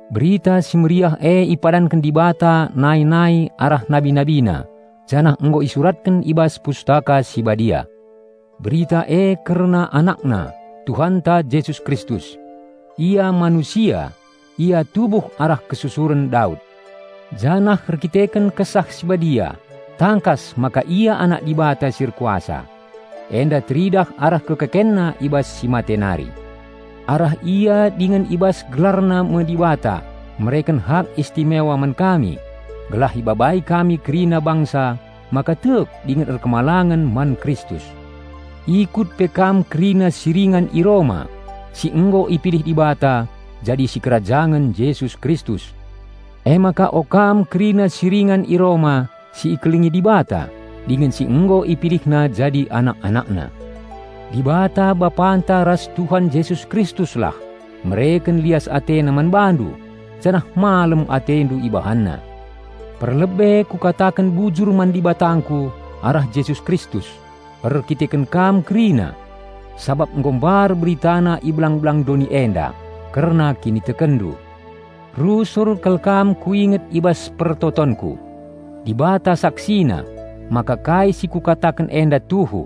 Berita Si Mehuli e ipadanken Dibata nai-nai arah nabi-NabiNa janah nggo isuratken i bas Pustaka Si Badia. Berita e kerna AnakNa, Tuhanta Jesus Kristus: Ia manusia, Ia tubuh arah kesusuren Daud. Janah erdandanken Kesah Si Badia tangkas maka Ia Anak Dibata si erkuasa. Enda teridah arah KekekenNa i bas si mate nari. Arah Ia, dingen i bas GelarNa me Dibata mereken hak istimewa man kami, gelah ibabai kami kerina bangsa maka tek dingen patuh man Kristus. Ikatpendu kerina si ringan i Roma, si nggo ipilih Dibata jadi sikerajangen Jesus Kristus. Emaka o kam kerina si ringan i Roma si ikelengi Dibata dingen si nggo IpilihNa jadi anak-AnakNa: Dibata Bapanta ras Tuhan Jesus Kristuslah mereken lias AteNa man bandu janah malem atendu IbahanNa. Perlebe kukataken bujur man Dibatangku arah Jesus Kristus, erdandanken kam kerina; sabap nggo mbar beritana i belang-belang doni enda kerna kinitekenndu. Rusur kal kam kuinget i bas pertotonku. Dibata saksina maka kai si kukataken enda tuhu.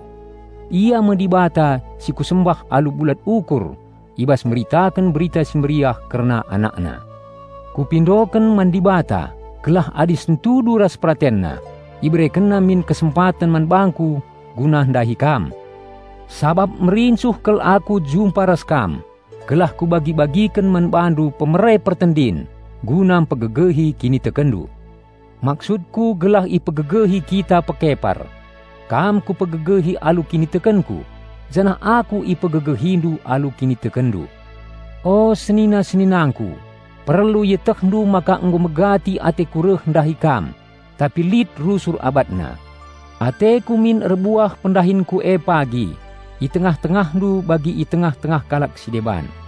Ia me Dibata si kusembah alu bulat ukur i bas meritaken Berita Si Mehuli kerna AnakNa. Kupindoken man Dibata gelah adi sentudu ras PeratenNa IberekenNa min kesempaten man bangku guna ndahi kam. Sabap merincuh kal aku jumpa ras kam, gelah kubagi-bagiken man bandu pemere pertendin guna mpegegehi kinitekenndu. Maksudku gelah ipegegehi kita pekepar; kam kupegegehi alu kinitekenku janah aku ipegegehindu alu kinitekenndu. O senina-seninangku, perlu ietehndu maka nggo megati ateku reh ndahi kam tapi lit rusur abatna. Ateku min erbuah pendahinku e pagi i tengah-tengahndu bagi i tengah-tengah kalak si deban.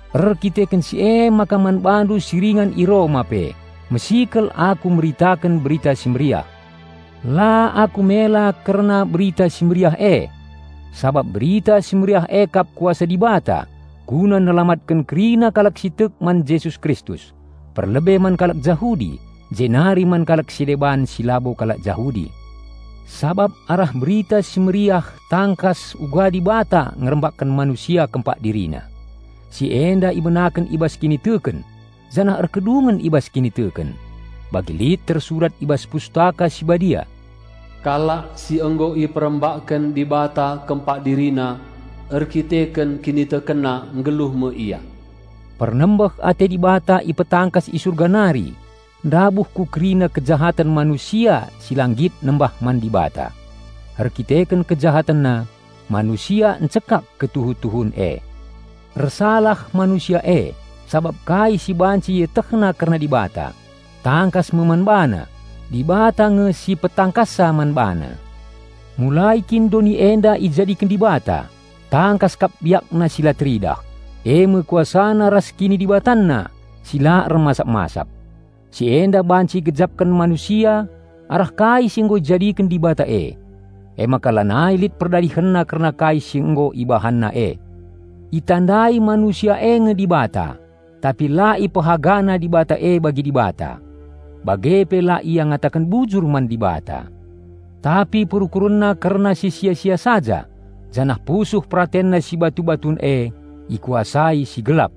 Erdandanken si emaka man bandu si ringan i Roma pe mesikel aku meritaken Berita Si Mehuli. La aku mela kerna Berita Si Mehuli e; sabap Berita Si Mehuli e kap Kuasa Dibata guna nelamatken kerina kalak si tek man Jesus Kristus, perlebe man kalak Jahudi, jenari man kalak si deban si labo kalak Jahudi. Sabap arah Berita Si Mehuli tangkas uga Dibata ngerambakken manusia kempak DiriNa. Si enda ibenaken i bas kiniteken janah erkedungen i bas kiniteken. Bagi lit tersurat i bas Pustaka Si Badia, "Kalak si nggo iperembakken Dibata kempak DiriNa erdandanken kinitekenna nggeluh me ia." Pernembeh ate Dibata ipetangkas i Surga nari ndabuh ku kerina kejahaten manusia si la nggit nembah man Dibata. Erkiteken kejahatenna, manusia encekak ketuhu-tuhun e. Ersalah manusia e, sabap kai si banci ietehna kerna Dibata, tangkas me man bana. Dibata nge si petangkassa man bana. Mulai kin doni enda ijadiken Dibata, tangkas kap BiakNa si la teridah, eme KuasaNa ras KinidibatanNa si la ermasap-masap. Si enda banci igejapken manusia arah kai si nggo ijadiken Dibata e. Emaka lanai lit perdalihenna kerna kai si nggo ibahanna e. Itandai manusia e nge Dibata, tapi la ipehagana Dibata e bagi Dibata; bage pe la ia ngataken bujur man Dibata. Tapi perukurenna kerna si sia-sia saja, janah pusuh peratenna si batu-batun e ikuasai si gelap.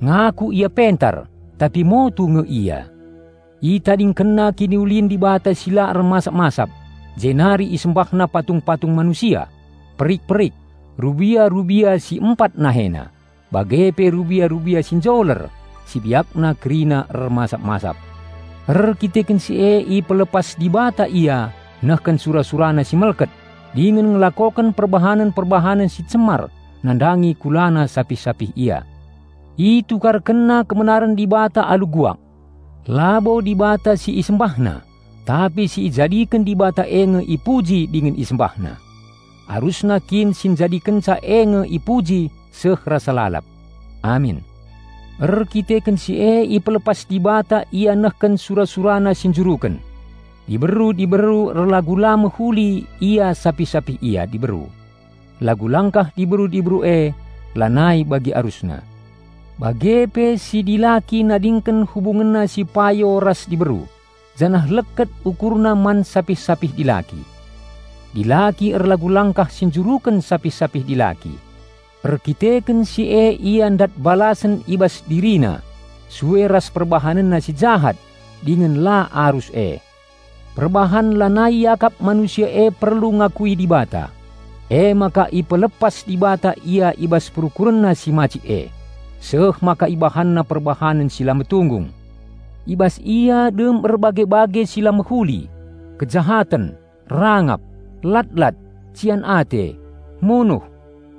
Ngaku ia pentar, tapi motu nge ia. Itadingkenna kiniulin Dibata si la ermasap-masap jenari isembahna patung-patung manusia, perik-perik, rubia-rubia si empat nahena, bage pe rubia-rubia si njoler si biakna kerina ermasa-masap. Erdandanken si e ipelepas Dibata ia nehken sura-surana si melket, dingen ngelakoken perbahanen-perbahanen si cemar nandangi kulana sapih-sapih ia. Itukarkenna kebenaren Dibata alu guak. Labo Dibata si isembahna, tapi si ijadiken Dibata e nge ipuji dingen isembahna. Arusna kin si Njadikenca e nge ipuji seh rasa lalap! Amin. Erdandanken si e ipelepas Dibata ia nehken sura-surana si njuruken. Diberu-diberu erlagu la mehuli ia sapih-sapih ia diberu. Lagu langkah diberu-diberu e lanai bagi arusna. Bage pe si dilaki nadingken hubungenna si payo ras diberu, janah leket ukurna man sapih-sapih dilaki. Dilaki erlagu-langkah si njuruken sapih-sapih dilaki; erkiteken si e ia ndat balasen i bas dirina sue ras perbahanenna si jahat dingen la arus e. Perbahan lanai iakap manusia e perlu ngakui Dibata, emaka ipelepas Dibata ia i bas perukurenna si macik e, seh maka ibahanna perbahanen si la metunggung. I bas ia dem erbage-bage si la mehuli: kejahaten, rangap, lat-lat, cian ate, munuh,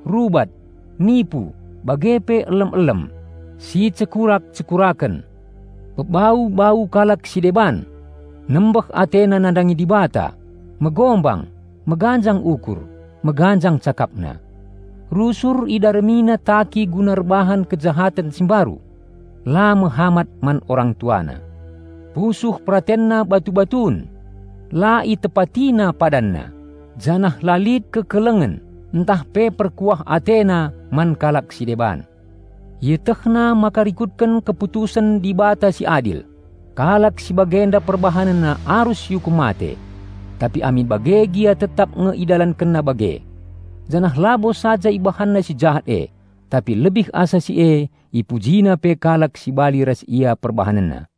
rubat, nipu, bage pe elem-elem, sicekurak-cekuraken, pebau-bau kalak si deban. Nembeh atena nandangi Dibata, megombang, meganjang ukur, meganjang cakapna. Rusur idaramina taki guna erbahan kejahaten si mbaru; la mehamat man orang tuana. Pusuh peratenna batu-batun; la itepatina padanna, janah la lit kekelengen ntah pe perkuah atena man kalak si deban. Ietehna maka rikutken keputusen Dibata si adil, kalak si bagenda perbahanenna arus iukum mate. Tapi amin bage gia tetap nge idalankenna bage. Janah labo saja ibahanna si jahat e, tapi lebih asa si e ipujina pe kalak si bali ras ia perbahanenna.